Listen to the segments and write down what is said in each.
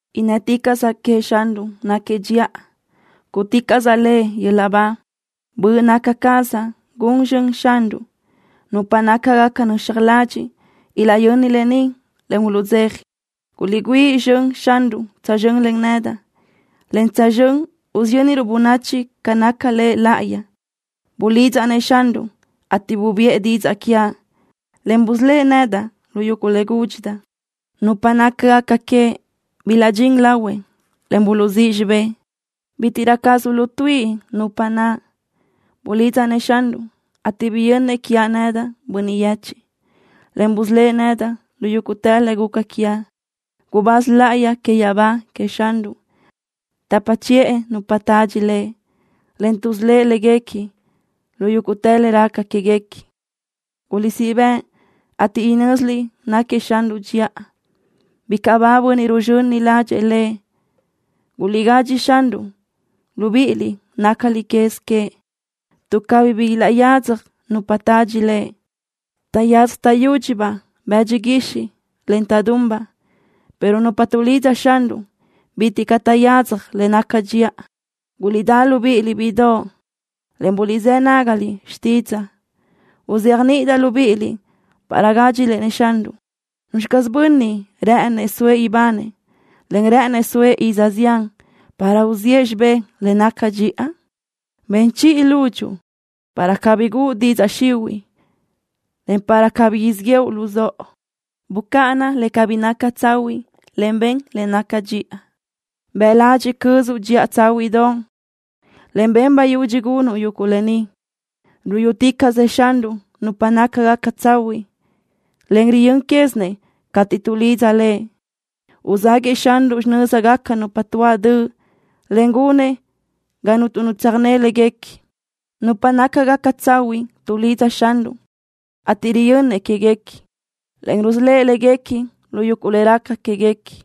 ¡Innë́ticaʼsaʼ queëʼ Xanruʼ náquiëʼ dxiʼa! ¡Cúʼuticaʼsaʼ Lëʼ yöl-laʼ ba! Böʼ naca cazaʼ gun zxön Xanruʼ. Nupa nácagaca nöxaj ladxiʼ ilaʼyöni lë ni, en uluʼdzeja. Guliʼgüíʼ zxönëʼ Xanruʼ tsözxö́n len nedaʼ, en tsözxö́n usiyönruʼ bönachi ca naca Lëʼ Laʼayi. Bulidzaʼ-nëʼ Xanruʼ, ateʼ bubiʼë didzaʼ quiaʼ, en busölë́ʼ nedaʼ lu yuguʼ le gúdxidaʼ. Nupa nácagaca queëʼ bilaʼdxín lahuëʼ, en buluʼzíʼ xibë́ʼ. Bítiʼrö caz uluʼtuíʼi nupa naʼ. Bulidzaʼ-nëʼ Xanruʼ, ateʼ biyönnëʼ quiaʼ nedaʼ, bönniʼ yechiʼ, en busölë́ʼ nedaʼ lu yúguʼtë le guca quiaʼ. Gubáz láʼayi que yaʼabá queëʼ Xanruʼ tapa chiʼë nupa tadxi Lëʼ, en tuʼsölë́ʼ léguequi lu yúguʼtë le raca quéguequi. Guliʼsíʼ bëʼë, ateʼ inö́ziliʼ náquiëʼ Xanruʼ dxiʼa. ¡Bicaʼ ba bönniʼ ruzxöni ládxëʼë Lëʼ! Guliʼgadxi Xanruʼ, libíʼiliʼ nácaliʼ quez queëʼ, tuʼ cabí bi ilaʼyadzaj nupa tadxi Lëʼ. Taʼyadzaj taʼyúdxibaʼ bëdxi guixiʼ, en taʼdunbaʼ, pero nupa tuʼlidza Xanruʼ bitiʼ caʼ taʼyadzaj le naca dxiʼa. Guliʼdá libíʼiliʼ, bíʼidoʼ, en buliʼzë́ nágaliʼ xtídzaʼa. Uzéajniʼidaʼ libíʼiliʼ para gádxiliʼ-nëʼ Xanruʼ. ¿Nuzxi caz bönniʼ rë́ʼënëʼ soëʼ ibanëʼ, en rë́ʼënëʼ soëʼ iz zián para uziʼë xibé le naca dxiʼa? Ben chiʼi lúdxuʼu para cabí guʼu didzaʼ xihuiʼ, en para cabí siʼ yéʼenuʼ luzóʼo. Bucáʼana le cabí naca tsahuiʼ, en ben le naca dxiʼa. Bëʼ ladxiʼ cözuʼ dxiʼa tsáhuiʼdoʼ, en ben bayudxi gunuʼ yuguʼ lë ni. Ruyúticaʼsëʼ Xanruʼ nupa nácagaca tsahuiʼ, en riyö́n quézinëʼ cateʼ tuʼlidza Lëʼ. Uzáguëʼë Xanruʼ xinö́zgaca nupa tuáʼ döʼ, en gunëʼ ga cuntu nu tsöjné léguequi. Nupa nácagaca tsahuiʼ tuʼlidza Xanruʼ, ateʼ riyönnëʼ quéguequi, en rusölë́ʼ léguequi lu yuguʼ le raca quéguequi.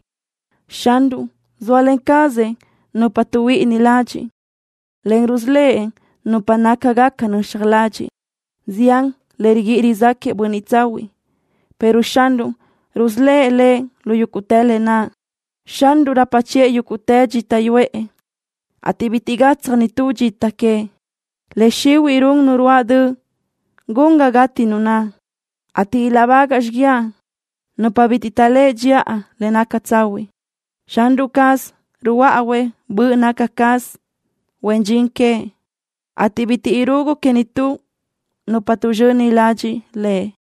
Xanruʼ zóalen cazëʼ nupa tuʼhuíʼini ladxiʼ, en rusölë́ʼ nupa nácagaca nöxaj ladxiʼ. Zián le riguíʼi rizáquëʼë bönniʼ tsahuiʼ, pero Xanruʼ rusölë́ʼ lëʼ lu yúguʼtë lë naʼ. Xanruʼ rapa chiʼë yúguʼtë dxita yuʼë, ateʼ bitiʼ gatsaj nitú dxita queëʼ. Le xihuiʼ run nu ruáʼ döʼ gun ga gati nu naʼ, ateʼ ilaʼbagaʼ xiguiaʼ nupa bitiʼ taʼléʼe dxiʼa le naca tsahuiʼ. Xanruʼ caz ruhuöáʼuëʼ böʼ nácagaca caz huen dxin queëʼ, ateʼ bitiʼ irugu que nitú nupa naʼ tuʼzxöni ladxiʼ Lëʼ.